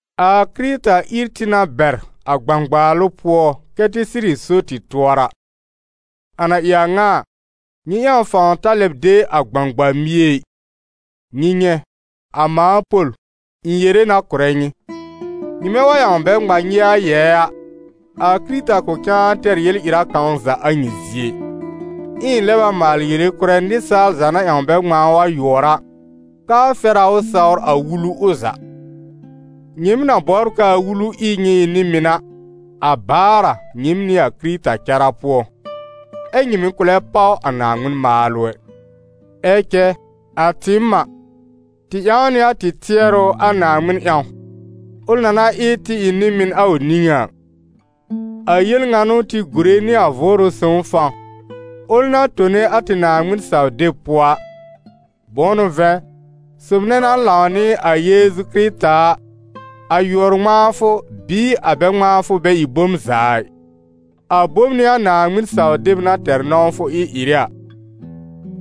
A Kɩrɩta ír tɩ na bɛr a gbãgbaalʋ pʋɔ, kɛ́ tɩ sɩrɩ so tɩ tʋɔra. A na ɩ a ŋa a, nyɩ ƴãw fãw ta lɛb de a gbãgba-mie ɩ. Nyɩ nyɛ̃, a mãa Pol, ɩ̃ yere na kʋ̀rɛ nyɩ: nyɩmɛ wa ƴãw bɛ ŋma nyɩ a yɛɛ a, a Kɩrɩta kʋ̃ cãa tɛr yel-ɩra kãw za a nyɩ zie ɩ. Ɛ ɩ̃ lɛb a maal yere kʋ̀rɛ nɩsaal za na ƴãw bɛ ŋmãa ʋ a yʋɔr a, k'aa fɛr a ʋ sawr a Wulu ʋ za. Nyɩɩm na bɔbr k'aa Wulu ɩ nyɩ ɩ nɩ-mɩn a, a baar a nyɩɩm nɩ a Kɩrɩta cara pʋɔ, ɛ́ nyɩ mɩ̀ kʋ̃ lɛ páw a Naaŋmɩn maalʋ ɛ. Ɛ cɛ a tɩɩm a, tɩ ƴãw nɩ a tɩ tɩɛrʋ a Naaŋmɩn ƴãw, ʋl na na ɩ tɩ ɩ nɩ-mɩn a ʋ niŋé a; a yel ŋa n'ʋ tɩ gùre nɩ a Vʋʋrʋ Sõw fãw, ʋl na tone a tɩ Naaŋmɩn-saw-deb pʋɔ a. Bʋ̃ʋ n'ʋ vɛ̃, sob nɛ na lãw nɩ a Yeezu Kɩrɩta a, a yʋɔr-ŋmãafʋ bɩɩ a bɛ-ŋmãafʋ bɛ ɩ bom za ɩ, a bom n'ɩ a Naaŋmɩn-saw-deb na tɛr nɔ̃wfʋ ɩ-ɩrɩ a.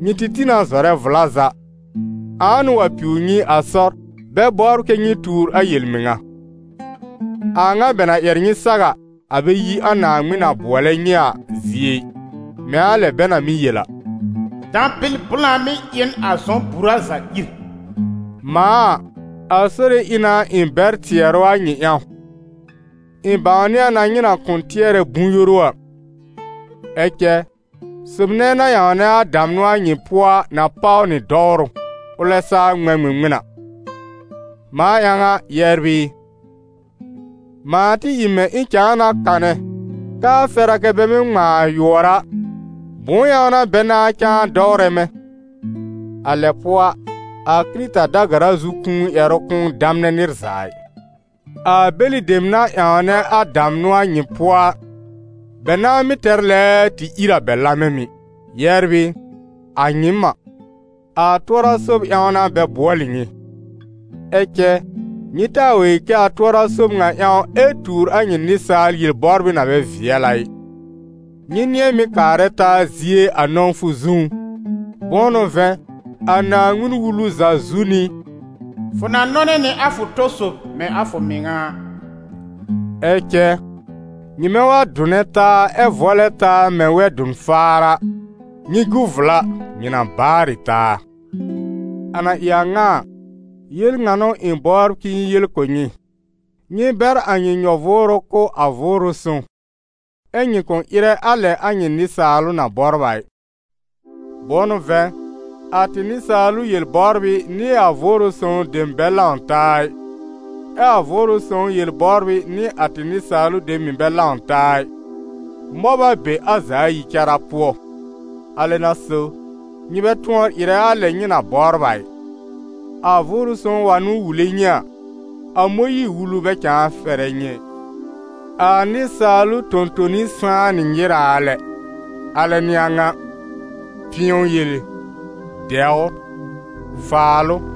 Nyɩ tɩ tĩ na zɔrɛ vla za! Ãa n'ʋ wa piw nyɩ a sɔr, bɛ bɔbr kɛ nyɩ tuur a yel-mɩŋa? A a ŋa bɛ na ƴɛr nyɩ saw a, a bɛ yi a Naaŋmɩn na bʋɔlɛ nyɩ a zie ɩ. Mɛ̃ a lɛ bɛ na mɩ́ yel a: «Dãbɩl blã mɩ́ ɩ n a zɔ̃-bura za ír.» Mãa a, a Sore ɩ na ɩ̃ bɛr tɩɛrʋ a nyɩ ƴãw: ɩ̃ bãwnɩ a na nyɩ na kʋ̃ tɩɛrɛ bʋ̃-yoru a. Ɛ cɛ sob nɛ na ƴãwnɛ a damnʋ a nyɩ pʋɔ a na páw nɩ dɔwrʋ, ʋlɛ saa ŋmɛ̃ ŋmɩŋmɩn a. Mãa ƴãw a, yɛbr ɩ, mãa tɩ ɩ mɛ̃ ɩ̃ cãa na kanɛ k'aa fɛr a kɛ bɛ mɩ́ ŋmãa a yʋɔr a, bʋ̃ʋ ƴãw n'a bɛ nãá cãa dɔwrɛ mɛ̃? A lɛ pʋɔ a, a Kɩrɩta da-gara zu kũu ƴɛrʋ kʋ̃ʋ damnɛ nɩr za ɩ. A bɛlɩ dem na ƴãwnɛ a damnʋ a nyɩ pʋɔ a, bɛ nãa mɩ́ tɛr lɛɛɛ tɩ ír a bɛ lamɛ mɩ̀. Yɛbr ɩ, a nyɩɩm a, a tʋɔra-sob ƴãw n'a bɛ bʋɔlɩ nyɩ. Ɛ cɛ nyɩ taa wa yel kɛ a tʋɔra-sob ŋa ƴãw ɛ́ tuur a nyɩ nɩsaal yel-bɔbrɩ na bɛ vɩɛl a ɩ. Nyɩ nɩ̃ɛ mɩ́ kaarɛ taa zie a nɔ̃wfʋ zũú. Bʋ̃ʋ n'ʋ vɛ̃, a Naaŋmɩn-Wulu za zu n'ɩ: «Fʋ na nɔnɛ nɩ a fʋ tɔ sob mɛ̃ a fʋ mɩŋa a.» Ɛ cɛ, nyɩmɛ wa dʋnɛ taa ɛ vɔlɛ taa mɛ̃ wɛ-dʋn-faar a, nyɩ gu vla, nyɩ na baarɩ taa. A na ɩ a ŋa a, yel ŋa n'ʋ ɩ̃ bɔbr k'ɩ̃ɩ yel kʋ̀ nyɩ: nyɩ bɛr a nyɩ nyɔ-vʋʋrʋ kʋ̀ a Vʋʋrʋ Sõw ɛ nyɩ kʋ̃ ɩrɛ a lɛ a nyɩ nɩsaalʋ na bɔbr a ɩ. Bʋ̃ʋ n'ʋ vɛ̃, a tɩ nɩsaalʋ yel-bɔbrɩ nɩ a Vʋʋrʋ Sõw dem bɛ lãw taa ɩ, ɛ a Vʋʋrʋ Sõw yel-bɔbrɩ nɩ a tɩ nɩsaalʋ dem mɩ̀ bɛ lãw taa ɩ, mɔb a be a za ayi cara pʋɔ. Alɛ n'a so, nyɩ bɛ tʋɔr ɩrɛ a lɛ nyɩ na bɔbr a ɩ. A Vʋʋrʋ Sõw wa n'ʋ wule nyɩ a, a Mõyiir-Wulu bɛ cãa fɛrɛ nyɩ ɛ. A nɩsaalʋ tõ-toni sãá nɩ nyɩraa lɛ, alɛ n'ɩ a ŋa: pɩ̃ɔ yele, dɛwr, faalʋ,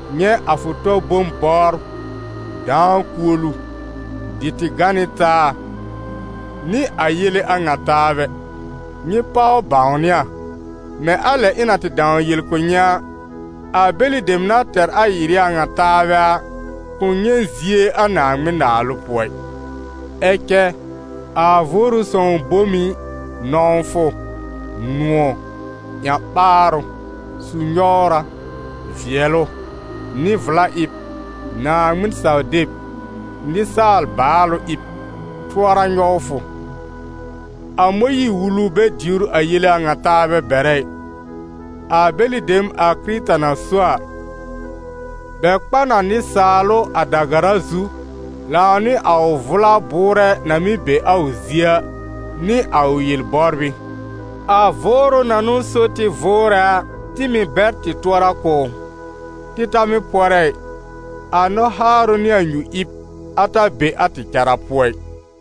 nyɛ̃ a fʋ tɔ bom bɔbr, dãa kuolu, dɩ tɩ gã nɩ taa, nɩ a yele a ŋa taabɛ. Nyɩ páw bãwnɩ a, mɛ̃ a lɛ ɩ̃ na tɩ dãw yel kʋ̀ nyɩ a, a bɛlɩ dem na tɛr a ɩ-ɩrɩ a ŋa taabɛ a, kʋ̃ nyɛ̃ zie a Naaŋmɩn-Naalʋ pʋɔ ɩ. Ɛ cɛ a Vʋʋrʋ Sõw bom ɩ: nɔ̃wfʋ, nʋ̃ɔ̀, ƴã-ɓaarʋ, su-nyɔwra, vɩɛlʋ, nɩ-vla-ɩb, Naaŋmɩn-saw-deb, nɩsaal baalʋ-ɩb, tʋɔra-nyɔwfʋ; a Mõyiir-Wulu bɛ diwr a yele a ŋa taabɛ bɛrɛ ɩ. A bɛlɩ dem a Kɩrɩta na so a, bɛ kpa n a nɩsaalʋ a da-gara zu lãw nɩ a ʋ vʋla bʋʋrɛ na mɩ́ be a ʋ zie a, nɩ a ʋ yel-bɔbrɩ. A Vʋʋrʋ na n'ʋ so tɩ vʋʋrɛ a, tɩ mɩ̀ bɛr tɩ tʋɔra kʋ̀ ʋ. Tɩ ta mɩ́ pɔrɛ ɩ, a nɔ-haarʋ nɩ a nyu-ɩb, a ta be a tɩ cara pʋɔ ɩ.